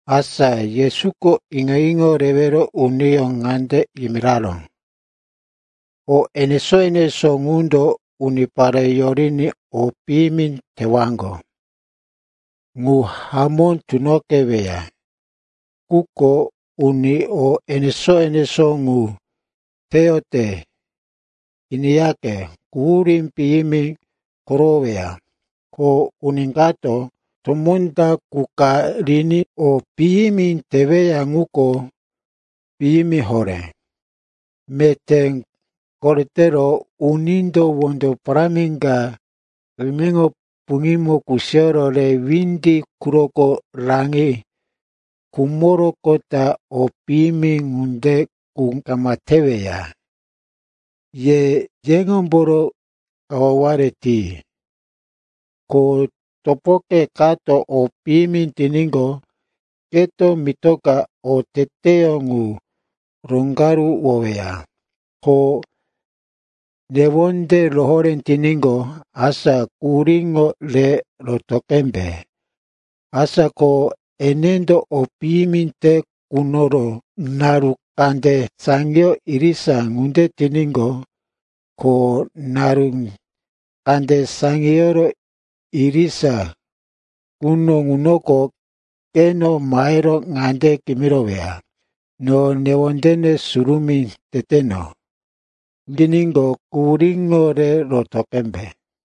Asa Yesuko iŋo-iŋo rewero uniyó ŋande yimiraró, “O enesó-enesó ŋundo unipare yoriní o piyimi tewaŋgo, ŋu hamó tunoqeweya. Quko uni o enesó-enesó ŋu teyote, iniyaqe, quhurí piyimi korowoweya. Ko uni kato tomó ta qu ka riní o piyimi teweya ŋuko piyimi horé. Meté koretero unindo wondo parámi ka eneŋo puŋímo kusiyoro re windi quroko raŋi khumoroqota o piyimi ŋunde qu kama teweya. Ye yeŋomboro kawaware ti. “Ko topoke kato o piyimi tiníqo, keto mitoka oteteyó ŋu roŋgaruwoweya. Ko newonde rohoré tiníqo, asa quhuríŋo re roto qembe. Asa ko enendo o piyimi te kunoro naru kande saŋiyoro irisa ŋunde tiníqo, ko naru kande saŋiyoro irisa quno ŋunoko keno mahero ŋande kimiroweya, ‘No newonde surumí teteno,’ yiníqo, quhuríŋo re roto qembe.”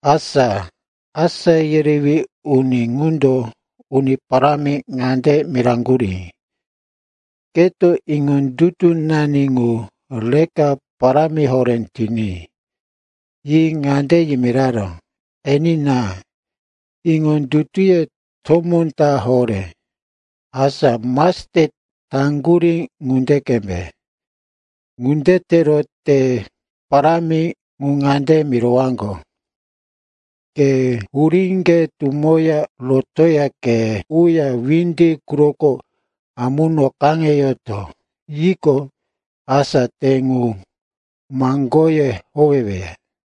Asa asá yerewí uni ŋundo Uni Parámi ŋande miraŋgurí, “Keto iŋondutunani ŋu reka parámi horé tiní.” Yi ŋande yimiraró, “Enina, iŋondutuye tomó ta horé, asa mastet taŋgurí ŋunde qembe, ŋunde tero te parámi ŋu ŋande mirowaŋgo, ‘Ke huríŋge tumoya rotoya ke uya windi quroko amuno kaŋeyoto,’ yiqo, asa te ŋu maŋgoye howeweya.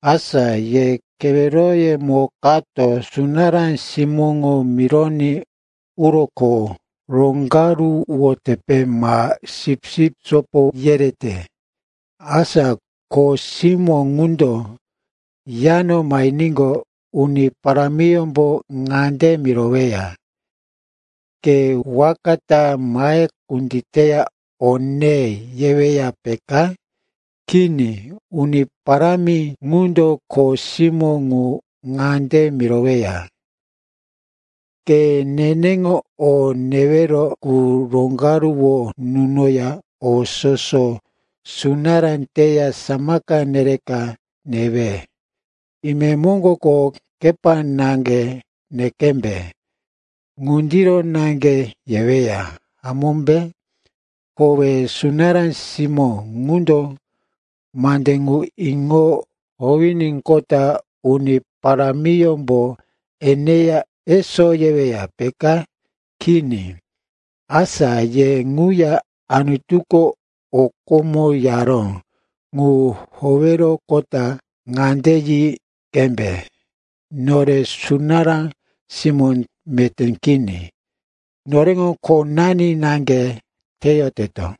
“Asa ye keweroyemo kato sunará simóŋo mironí uro kho roŋgaruwotepe ma sipsip sopo yerete. Asa kho simó ŋundo yano mahiníqo, uni parámiyómbo ŋande miroweya, ‘Ke waka ta mahe kunditeya o ne,’ yeweya, peka? Kini, uni parámi ŋundo kho simó ŋu ŋande miroweya, ‘Ke neneŋo o newero qu roŋgaruwo nunoya o soso sunará teya samaka nereka newe. Imemoŋgoko kepa naŋge ne qembe.’ Ŋundiro naŋge yeweya, hamómbe? Kowe sunará simó ŋundo mande ŋu iŋo howiníqota uni parámiyómbo eneya, eso, yeweya, peka? Kini. Asa ye ŋuya, Anutuko o komo yaró ŋu howeroqota ŋande yi qembe, ‘Nore sunará simó meté kini. Noreŋo khonani naŋge teyoteto.’”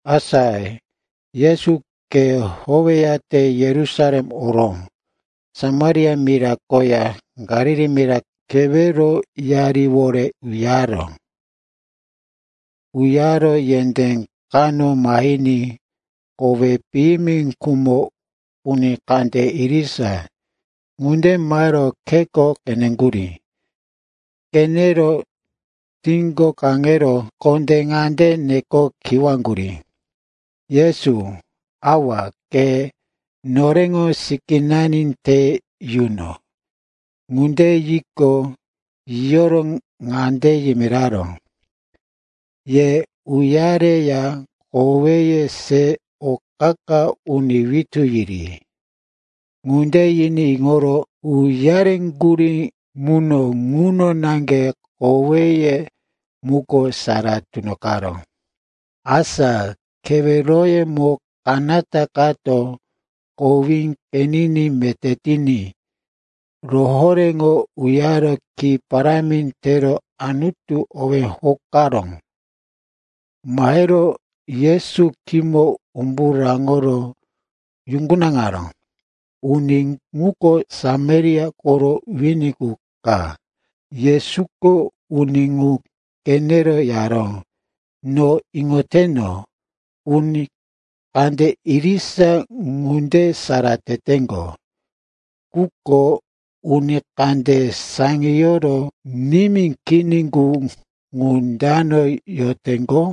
Asa Yesu khe howeyate Yerusalem oro Samaria mira koya Galili mira keweroyariwore uyaró. Uyaro yendé kano mahiní kowí piyimi khumo uni kande irisa ŋunde mahero kheko qeneŋgurí. Qenero tíko kaŋero kondé ŋande neke kiwaŋgurí, “Yesu, awa, ke noreŋo sikínani te yuno.” Ŋunde yiqo, yiyoro ŋande yimiraró, “Ye uyareya koweye se o qa-qa uni witú yiri.” Ŋunde yiní iŋoro uyareŋgurí muno ŋuno naŋge koweye muko sara tunoqaró. Asa keweroyemo kanata kato kowí qeniní meté tiní, rohoréŋo uyaro ki parámi tero Anutu owí hokaró. Mahero Yesu khímo umbu raŋoro yuŋgunaŋaró. Uni ŋuko Samaria koro wini qu ka. Yesuko uni ŋu qenero yaró, “No iŋoteno, uni kande irisa ŋunde sara teteŋgo. Quko uni kande saŋiyoro nimí kini qu, ŋu dano yoteŋgo?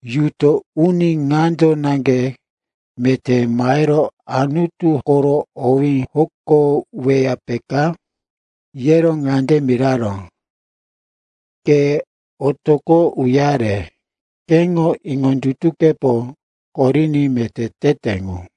Yuto uni ŋando naŋge meté mahero Anutu koro owí hokoweya, peka?” Yero ŋande miraró, “Ke otoqo uyare. Keŋo iŋondutukepo koriní meté tete ŋu.”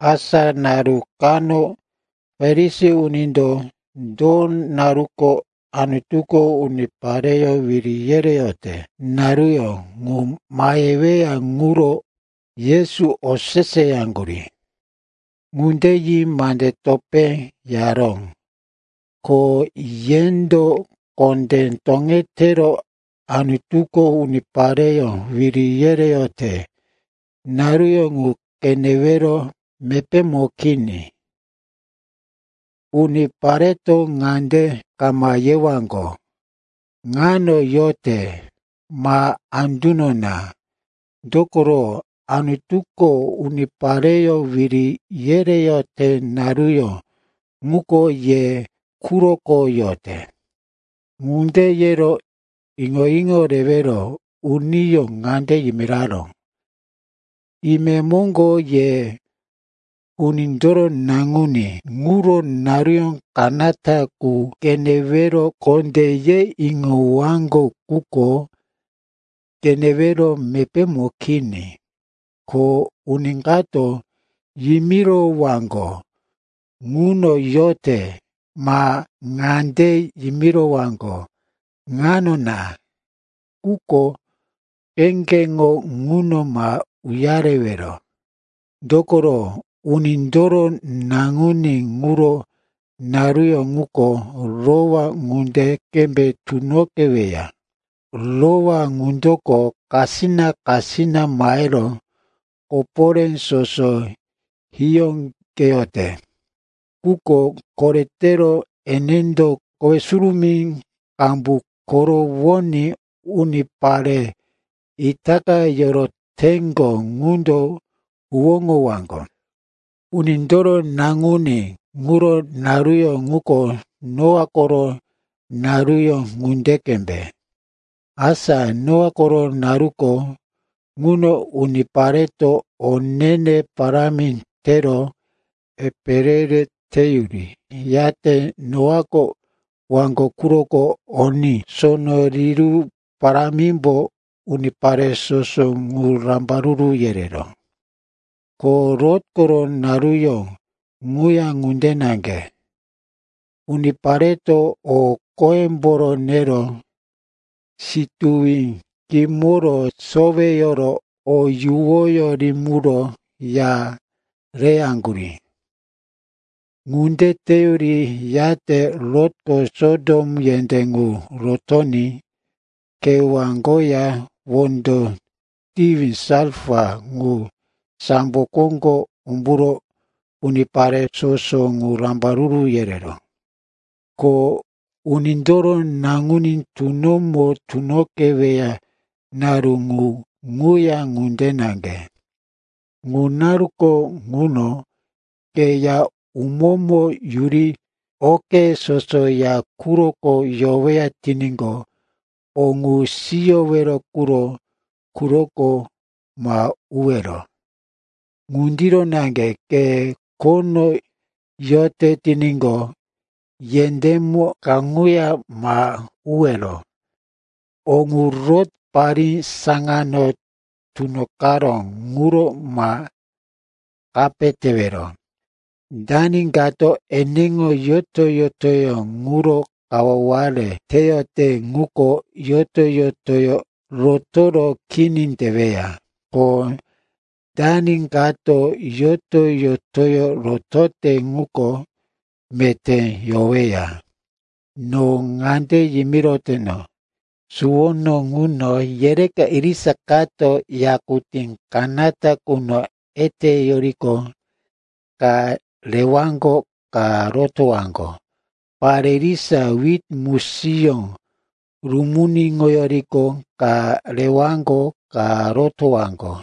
Asa naru kano Farisi unindo do naruko Anutuko unipareyó wiri yereyote naruyó ŋu maheweya ŋuro Yesu oseseyaŋgurí. Ŋunde yi mande topé yaró, “Ko yendo kondé toŋetero Anutuko unipareyó wiri yereyote naruyó ŋu qenewero mepémo kini. Unipareto ŋande kama yewaŋgo, ‘Ŋano yote,’ ma, ‘Anduno na.’ Dokoro Anutuko unipareyó wiri yereyote naruyó ŋuko ye quroko yote.” Ŋunde yero iŋo-iŋo rewero uniyó ŋande yimiraró, “Imemoŋgo ye Unindoro Naŋuní ŋuro naru kanata qu qenewero kondé ye iŋowaŋgo, quko qenewero mepémo kini. Ko uni kato yimirowaŋgo, ‘Ŋuno yote,’ ma ŋande yimirowaŋgo, ‘Ŋano na.’ Quko kheŋgeŋo ŋuno ma uyarewero. Dokoro Unindoro Naŋuní ŋuro naruyó ŋuko rowá ŋunde qembe tunoqeweya. Rowá ŋundoko kasina-kasina mahero koporé soso hiyóqeyote. Quko koretero enendo kowe surumí qambu korowoní unipare itaka yoroteŋgo ŋundo huwóŋowaŋgo. “Unindoro Naŋuní ŋuro naruyó ŋuko Noa koro naruyó ŋunde qembe. Asa Noa koro naruko ŋuno unipareto o ne-ne parámi tero epe re-re teyuri, yate Noako waŋgo quroko oní sono riru parámimbo unipare soso ŋu rambaruru yereró. “Ko Lot koro naruyó ŋuya ŋunde naŋge. Unipareto o qoyemboro nero, situwi kimoro soweyoro, o yuwoyó rimiro, ya reyaŋgurí. Ŋunde teyuri, yate Lotko Sotom yendé ŋu rotoní kewá koya wondo tiwi salfa ŋu sambo koŋgo umburo unipare soso ŋu rambaruru yereró. “Ko Unindoro Naŋuní tunomo tunoqeweya naru ŋu ŋuya ŋunde naŋge. Ŋu naruko ŋuno ke ya umómo yuri oke soso ya quroko yoweya tiníqo, o ŋu siyowero ŋuro quroko ma uwero. Ŋundiro naŋge, ke khono yote tiníqo, yendémo kaŋuya ma uwero. O ŋu Lot parí saŋano tunoqaró ŋuro ma kape tewero. Dani kato eneŋo yoto-yotoyó ŋuro kawaware teyote ŋuko yoto-yotoyó rotoro kini teweya. Ko dani kato yoto-yotoyó rotote ŋuko meté yoweya. No ŋande yimiroteno, suwono ŋuno yereka irisa kato yakutí kanata quno eteyoriqo ka rewaŋgo, ka rotowaŋgo. Pare irisa wit musiyó rumuniŋoyoriqo ka rewaŋgo, ka rotowaŋgo.”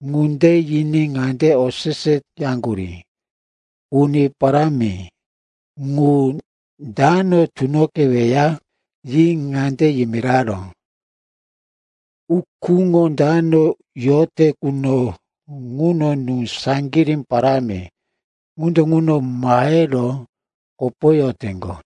Ŋunde yiní ŋande oseseyaŋgurí, “Uni Parámi, ŋu dano tunoqeweya?” Yi ŋande yimiraró, “Ukúŋo dano yote quno ŋuno nú saŋgirí parámi ŋundo ŋuno mahero kopoyoteŋgo.”